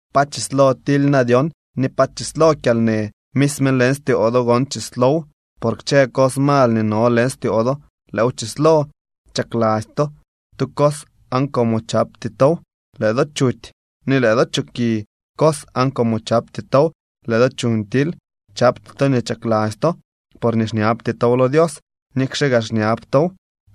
¿Pa chislo tily na dyon ni pa chislo kyalnë? Misme leñ styoo do gon chislow, por kchë cos mal nii no leñ styoo do lëëw chislo. Chakladzy to tu cos aan como chapty tow, lëë do chuty, ni lëë do choki cos aan como chapty tow, lëë do chuñ tily. Chapty to nii chakladzy to, porñee xñabty tow lo Dios. Nikxe gaa xñab tow,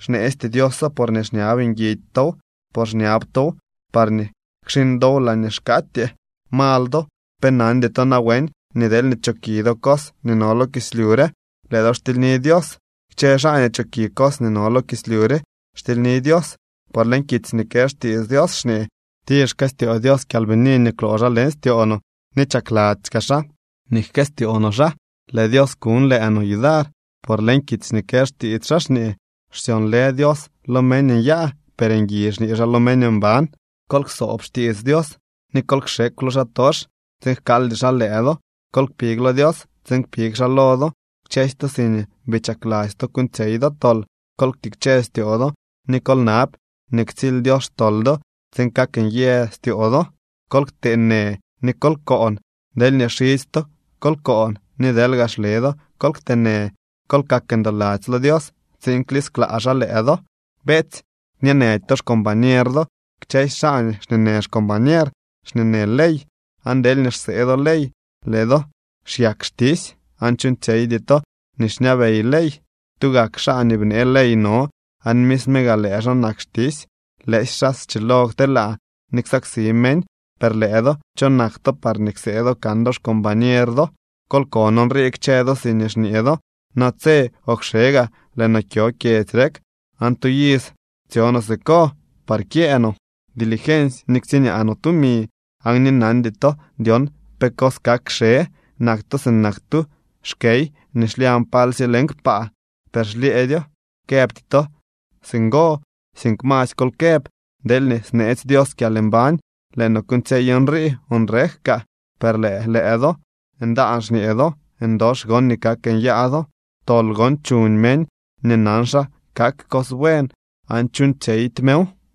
xneesty Dioso, porñee xñab nguidy tow, por xñab tow parñee kxiñ dow laañee xkaatyee. ¡Mal do! ¿Pe nandy to nawen nii deelñee choki do cos nii no lo kislyu re, lëë do xtilyni Dios? Kchë xaa nii choki cos nii no lo kislyu re, xtilyni Dios. Por leñ kitsy nii kë xtiits Dios xñee: “Tir xkëstyoo Dios kyalbini nii kwloo xaa leñ styoo no ni chakladzy kaa xaa nii jkëstyoo no xaa.” Lëë Dios kuñ lëë no yudar. Por leñ kitsy nii kë xtiits xaa xñee: “Xsyonlë Dios lo meñ nyaa. Per ngui xñee xaa lo meñ mban.” Kol ksoob xtiits Dios, ni kol kxekw lo xaatox, tsiin jkaaldy xaa lëë do. Kol kpig lo Dios tsiin kpig xaa lo do. Kchësy to siñee bii chakladzy to kuuñtsyey do tol, kol ktikche styoo do ni kol nab nii ktsily Dios xtol do, tsiin kak nyë styoo do. Kol ktee në ni kol koon. Deelñee xidzy to kol koon ni deelñee gaa xle do kol kte në. Kol kak ndoladzy lo Dios tsiin klisklaa xaa lëë do. Beetsy, kñeenëdy to xcombañer do. Kchësy xaa nii xñeenë xcombañer xñeenë ley. Aan deelñee xsee do ley, lëë do xyak xtisy aan chuuñtsyeydy to nii xñabey ley. Tugak xaa nii bnee ley no, aan misme gak lëë xaa nak xtisy lëësy xaa schilo kteelaa ni ksaksi meñ. Per lëë do, ¿cho nak to parñee ksee do kan do xcombañer do? Kol kon nrii kchë do siñee xñee do: “Natse o kxe gaa lëë noo kyo kyedzy rek, aan tu iz tsyo noo siko par kyëë noo dilgensy ni ktsiñaa noo tumi”, aan ni nandy to dyon pe cos kak kxe. Nak to sinak tu xkey nii xlyañ palsye leñ kpaa, per xlyëëdyo. Këbty to singo, sink masy kol këb: “Deelñee sneetsy Dios kyalmbañ, lëë noo kuuñtsyey nrii o nrek kaa.” Per lëë lëë do ndaan xñee do, ndox gon nii kak nyaa do. Tol gon chuñ meñ nii nan xa kak cos buen aan chuuñtsyeydy mew.